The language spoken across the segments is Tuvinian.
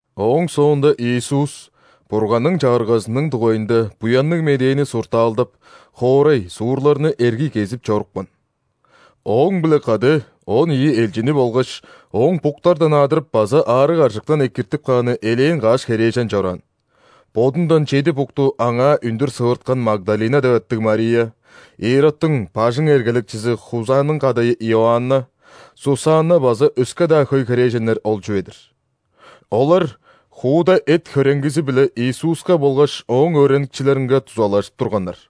Ооң соонда Иисус Бурганның Чагыргазының дугайында Буянныг Медээни суртаалдап, хоорай, суурларны эргий кезип чорупкан. Ооң-биле кады он ийи элчини болгаш Ооң буктардан адырып база аарыг-аржыктан экиртип кааны элээн каш херээжен чораан: бодундан чеди букту Аңаа үндүр сывырткан Магдалина деп аттыг Мария, Иродтуң бажың эргелекчизи Хузаның кадайы Иоанна, Сусанна база өске-даа хөй херээженнер ол чүве-дир. Олар хууда эт-хөреңгизи-биле Иисуска болгаш Ооң өөреникчилеринге дузалажып турганнар.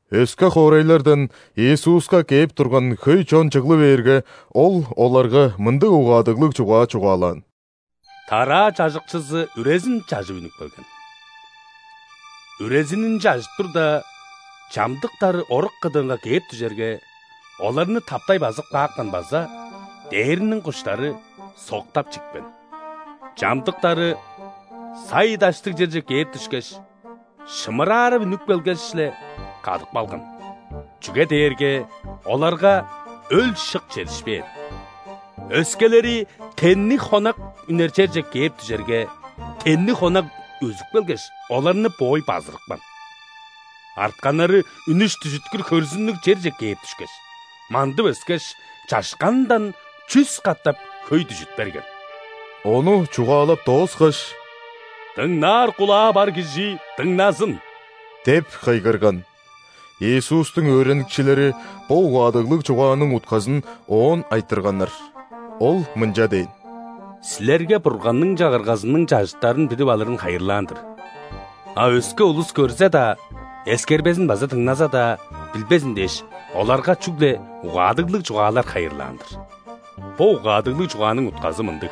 Өске хоорайлардан Иисуска кээп турган хөй чон чыглы бээрге, Ол оларга мындыг угаадыглыг чугаа чугаалаан: «Тараа чажыкчызы үрезин чажып үнүп келген. Үрезинин чажып турда, чамдыктары орук кыдыынга кээп дүжерге, оларны таптай базып каапкан база дээрниң куштары соктап чипкен. Чамдыктары сай-даштыг черже кээп дүшкеш, шымырарып үнүп келгеш-ле, кадып калган, чүге дээрге оларга өл-шык чедишпээн. Өскелери тенниг хонак үнер черже кээп дүжерге, тенниг хонак өзүп келгеш, оларны боой базырыпкан. Артканнары үнүш-дүжүткүр хөрзүннүг черже кээп дүшкеш, мандып өскеш, чашканындан чүс катап хөй дүжүт берген». Ону чугаалап дооскаш: «Дыңнаар кулаа бар кижи дыңназын!» – деп кыйгырган. Иисустуң өөреникчилери бо угаадыглыг чугааның утказын Оон айтырганнар. Ол мынча дээн: «Силерге Бурганның Чагыргазының чажыттарын билип алырын хайырлаан-дыр, а өске улус көрзе-даа, эскербезин база дыңназа-даа, билбезин дээш, оларга чүгле угаадыглыг чугаалар хайырлаан-дыр. Бо угаадыглыг чугааның утказы мындыг: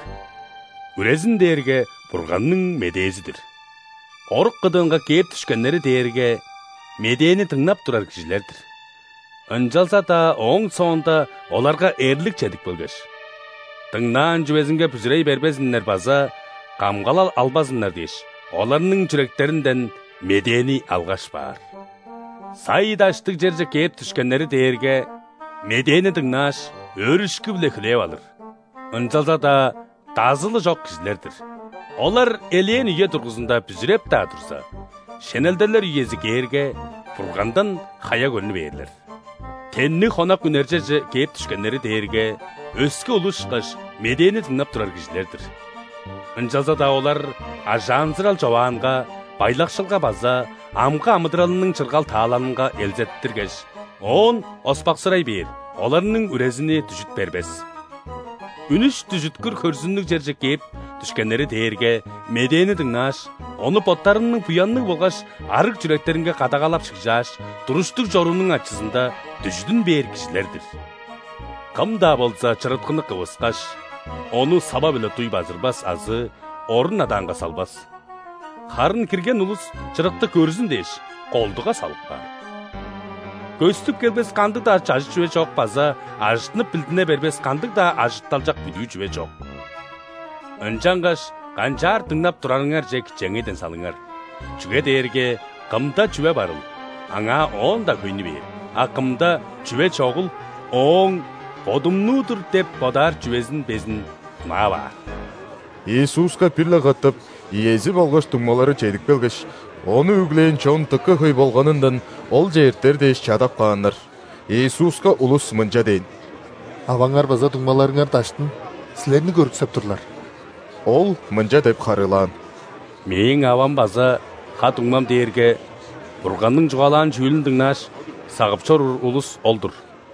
үрезин дээрге Бурганның медээзи-дир. Орук кыдыынга кээп дүшкеннери дээрге медээни дыңнап турар кижилер-дир. Ынчалза-даа ооң соонда оларга эрлик чедип келгеш, дыңнаан чүвезинге бүзүрей бербезиннер база камгалал албазыннар дээш, оларның чүректеринден медээни алгаш баар. Сай-даштыг черже кээп дүшкеннери дээрге медээни дыңнааш, өөрүшкү-биле хүлээп алыр, ынчалза-даа дазылы чок кижилер-дир. Олар элээн үе дургузунда бүзүреп-даа турза, шенелделер үези кээрге, Бургандан хая көрнү бээрлер. Тенниг хонак үнер черже кээп дүшкеннери дээрге, өске улус ышкаш, медээни дыңнап турар кижилер-дир. Ынчалза-даа олар ажаанзырал-човаанга, байлакшылга база амгы амыдыралының чыргал-таалалынга элзеттиргеш, оон оспаксырай бээр, оларның үрезини дүжүт бербес. Үнүш-дүжүткүр хөрзүннүг черже кээп дүшкеннери дээрге медээни дыңнааш, ону боттарының буянныг болгаш арыг чүректеринге кадагалап шыгжааш, туруштуг чоруунуң ачызында дүжүдүн бээр кижилер-дир. Кым-даа болза чырыткыны кывыскаш, ону сава-биле дуй базырбас азы орун адаанга салбас, харын кирген улус чырыкты көрзүн дээш, колдуга салып каар. Көстүп келбес кандыг-даа чажыт чүве чок база ажыттынып билдине бербес кандыг-даа ажытталчак бүдүү чүве чок. Ынчангаш канчаар дыңнап турарыңарже кичээнгейден салыңар: чүге дээрге кымда чүве барыл, аңаа оон-даа хөйнү бээр, а кымда чүве чогул, ооң „бодумнуу-дур“ деп бодаар чүвезин безин хунаап аар». Иисуска бир-ле катап иези болгаш дуңмалары чедип келгеш, Ону үглээн чон дыка хөй болганындан Олче эртер дээш чадап кааннар. Иисуска улус мынча дээн: «Аваңар база дуңмаларыңар даштын Силерни көрүксеп турлар». Ол мынча деп харыылаан: «Мээң авам база ха-дуңмам дээрге Бурганның чугаалаан чүүлүн дыңнааш, сагып чоруур улус ол-дур».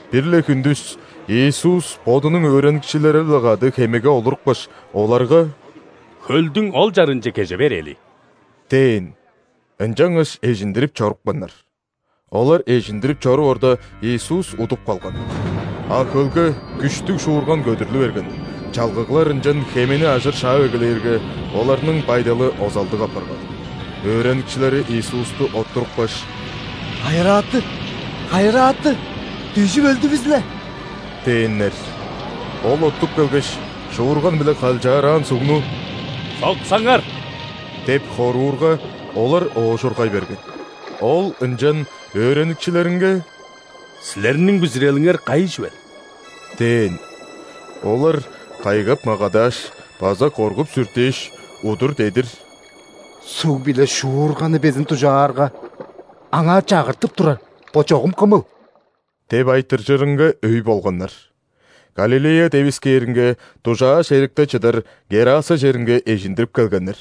Бир-ле хүндүс Иисус Бодунуң өөреникчилери-биле кады хемеге олурупкаш, оларга: «Хөлдүң ол чарыынче кеже берээли» – дээн. Ынчангаш эжиндирип чорупканнар. Олар эжиндирип чоруп орда, Иисус удуп калган. А хөлге күштүг шуурган көдүрлү берген, чалгыглар ынчан хемени ажыр шаап эгелээрге, оларның байдалы озалдыг апарган. Өөреникчилери Иисусту оттурупкаш: «Хайырааты! Хайырааты! Дүжүп өлдүвүс-ле!» – дээннер. Ол оттуп келгеш, шуурган биле калчаараан сугну: «Соксаңар!» – деп хоруурга, олар оожургай берген. Ол ынчан өөреникчилеринге: «Силерниң бүзүрелиңер кайы чүвел?» – дээн. Олар кайгап-магадааш база коргуп-сүртээш, удур-дедир: «Суг биле шуурганны безин дужаарга, Аңаа чагыртып турар – бо чогум Кымыл?» – деп айтыржырынга өй болганнар. Галилея девискээринге дужааш эрикте чыдар Гераса черинге эжиндирип келгеннер.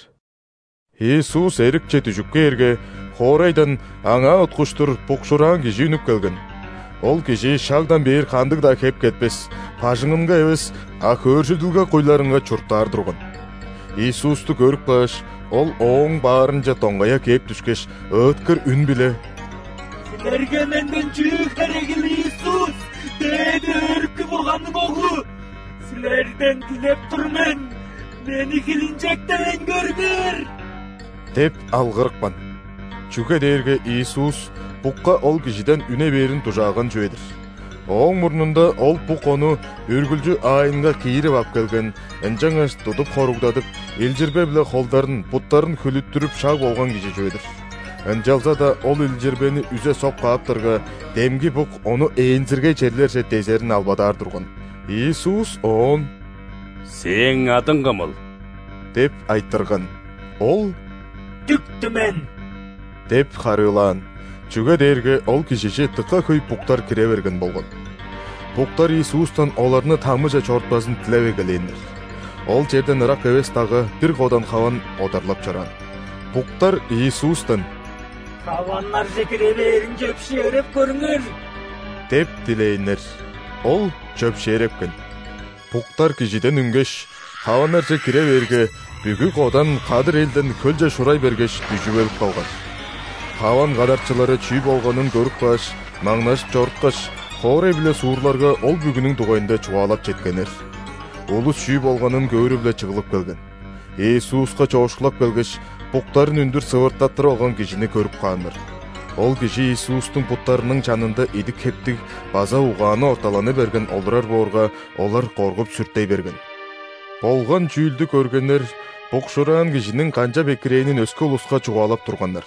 Иисус эрикче дүжүп кээрге, хоорайдан Аңаа уткуштур букшуураан кижи үнүп келген. Ол кижи шагдан бээр кандыг-даа хеп кетпес, бажыңынга эвес, а хөөржүдүлге куйларынга чурттаар турган. Иисусту көрүп кааш, ол Ооң баарынче доңгая кээп дүшкеш, ыыткыр үн-биле: «Силерге менден чүү херегил, Иисус, Дээди Өрүкү Бурганның Оглу? Силерден дилеп тур мен: мени хилинчектевейн көрүңер» – деп алгырыпкан. Чүге дээрге Иисус букка ол кижиден үне бээрин дужааган чүве-дир. Ооң мурнунда ол бук ону үргүлчү аайынга киирип ап келген, ынчангаш тудуп хоругдадып, илчирбе-биле холдарын, буттарын хүлүттүрүп шаг болган кижи чүве-дир. Ынчалза-даа ол илчирбени үзе соп кааптарга, демги бук ону ээнзиргей черлерже дезерин албадаар турган. Иисус оон: «Сээң адың кымыл?» – деп айтырган. Ол: «Дүк-түмен» – деп харыылаан, чүге дээрге ол кижиже дыка хөй буктар кире берген болган. Буктар Иисустан оларны ·тамыже чорутпазын дилеп эгелээннер. Ол черден ырак эвес дагга бир кодан хаван одарлап чораан. Буктар Иисустан: «Хаваннарже кире бээрин чөпшээреп көрүңер» – деп дилээннер. Ол чөпшээрепкен. Буктар кижиден үнгеш, хаваннарже кире бээрге, бүгү кодан кадыр элден хөлче шурай бергеш, дүжүп өлүп калган. Хаван кадарчылары чүү болганын көрүп кааш, маңнажып чоруткаш, хоорай биле суурларга ол бүгүнүң дугайында чугаалап четкеннер. Улус чүү болганын көөрү-биле чыглып келген. Иисуска чоокшулап келгеш, буктарын үндүр сывыртаттырып алган кижини көрүп кааннар. Ол кижи Иисустуң буттарының чанында идик-хептиг база угааны орталаны берген олурар боорга, олар коргуп-сүртей берген. Болган чүүлдү көргеннер букшуураан кижиниң канчап экирээнин өске улуска чугаалап турганнар.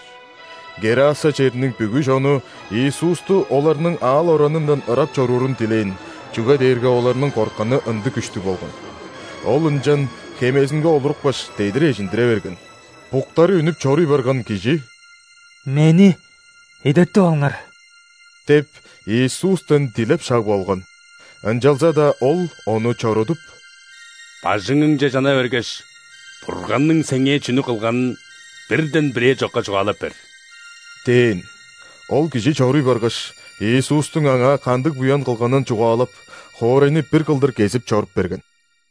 ГерасаR чериниң бүгү чону Иисусту оларның аал-оранындан ырап чоруурун дилээн, чүге дээрге оларның кортканы ындыг күштүг болган. Ол ынчан хемезинге олурупкаш, дедир эжиндире берген. Буктары үнүп чоруй барган кижи: «Мени эдертип алыңар» – деп, Иисустан дилеп шаг болган. Ынчалза-даа Ол ону чорудуп: «Бажыңыңче чана бергеш, Бурганның сеңээ чүнү кылганын бирден бирээ чокка чугаалап бер» – дээн. Ол кижи чоруй баргаш, Иисустуң аңаа кандыг буян кылганын чугаалап, хоорайны бир кылдыр кезип чоруп берген.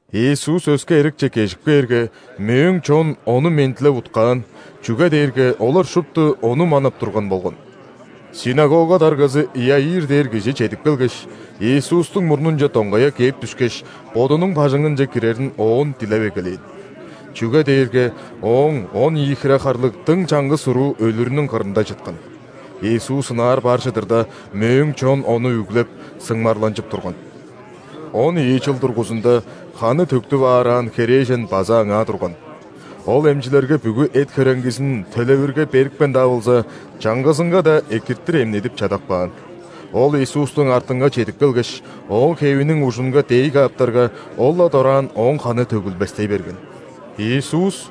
Иисус өске эрикче кежип кээрге, мөөң чон Ону мендилеп уткаан, чүге дээрге олар шупту Ону манап турган болган. ·Синагога даргазы Иаир дээр кижи чедип келгеш, Иисустуң мурнунче доңгая кээп дүшкеш, бодунуң бажыңынче кирерин Оон дилеп эгелээн. Чүге дээрге ооң он ийи хире харлыг дың чаңгыс уруу өлүрүнүң кырында чыткан. Иисус ынаар бар чыдырда, мөөң чон Ону үглеп, сыңмарланчып турган. Он ийи чыл дургузунда ханы төктүп аараан херээжен база аңаа турган. Ол эмчилерге бүгү эт-хөреңгизин төлевирге берипкен-даа болза, чаңгызынга-даа экиртир эмнедип чадап каан. Ол Иисустуң артынга чедип келгеш, Ооң хевиниң ужунга дээй кааптарга, ол-ла дораан ооң ханы төгүлбестей берген. Иисус: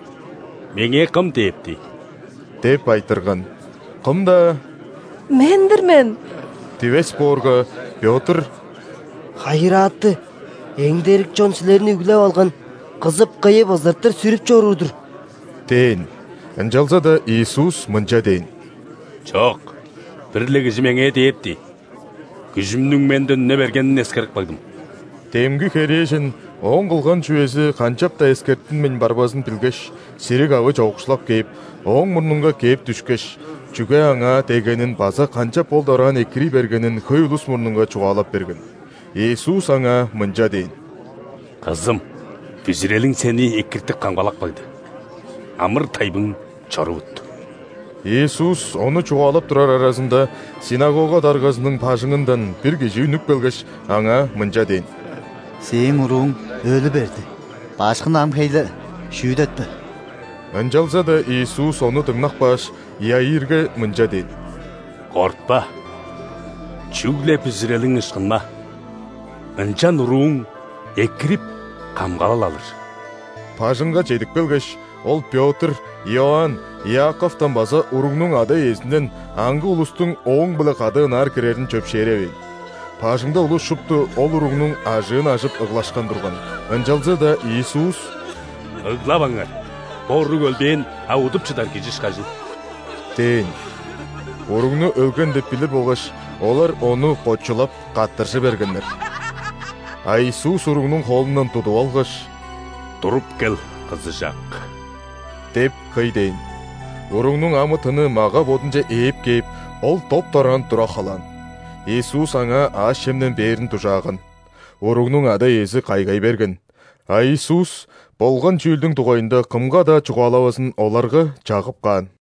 «Меңээ кым дээпти?» – деп айтырган. Кым-даа: «Мен-дир мен» – дивес боорга, Пётр: «Хайырааты, эңдерик чон Силерни үглеп алган, кызып-кыйып, ызыртыр сүрүп чоруур-дур» – дээн. Ынчалза-даа Иисус мынча дээн: «Чок, бир-ле кижи Меңээ дээпти, күжүмнүң Менден үне бергенин эскерип кагдым». Демги херээжен ооң кылган чүвези канчап-даа эскертинмейн барбазын билгеш, сири-кавы чоокшулап кээп, Ооң мурнунга кээп дүшкеш, чүге Аңаа деггенин база канчап ол дораан экирий бергенин хөй улус мурнунга чугаалап берген. Иисус аңаа мынча дээн: «Кызым, бүзүрелиң сени экиртип-камгалап кагды, амыр-тайбың чорувут». Иисус ону чугаалап турар аразында, синагога даргазының бажыңындан бир кижи үнүп келгеш, аңаа мынча дээн: «Сээң урууң өлү берди, Башкыны ам хей-ле шүүдетпе». Ынчалза-даа Иисус ону дыңнап кааш, Иаирге мынча дээн: «Кортпа, чүгле бүзүрелиң ышкынма, ынчан урууң экирип, камгалал алыр». Бажыңга чедип келгеш, Ол Пётр, Иоанн, Иаковтан база уругнуң ада-иезинден аңгы улустуң Ооң-биле кады ынаар кирерин чөпшээревээн. Бажыңда улус шупту ол уругнуң ажыын ажып ыглашкан турган, ынчалза-даа Иисус: «Ыглаваңар, бо уруг өлбээн, а удуп чыдар кижи ышкажыл» – дээн. Уругну өлген деп билир болгаш, олар Ону кочулап, каттыржы бергеннер. А Иисус уругнуң холундан тудуп алгаш: «Туруп кел, кызыжак!» – деп кый дээн. Уругнуң амы-тыны мага-бодунче ээп кээп, ол доп-дораан тура халаан. Иисус аңаа аъш-чемден бээрин дужааган. Уругнуң ада-иези кайгай берген, а Иисус болган чүүлдүң дугайында кымга-даа чугаалавазын оларга чагып каан.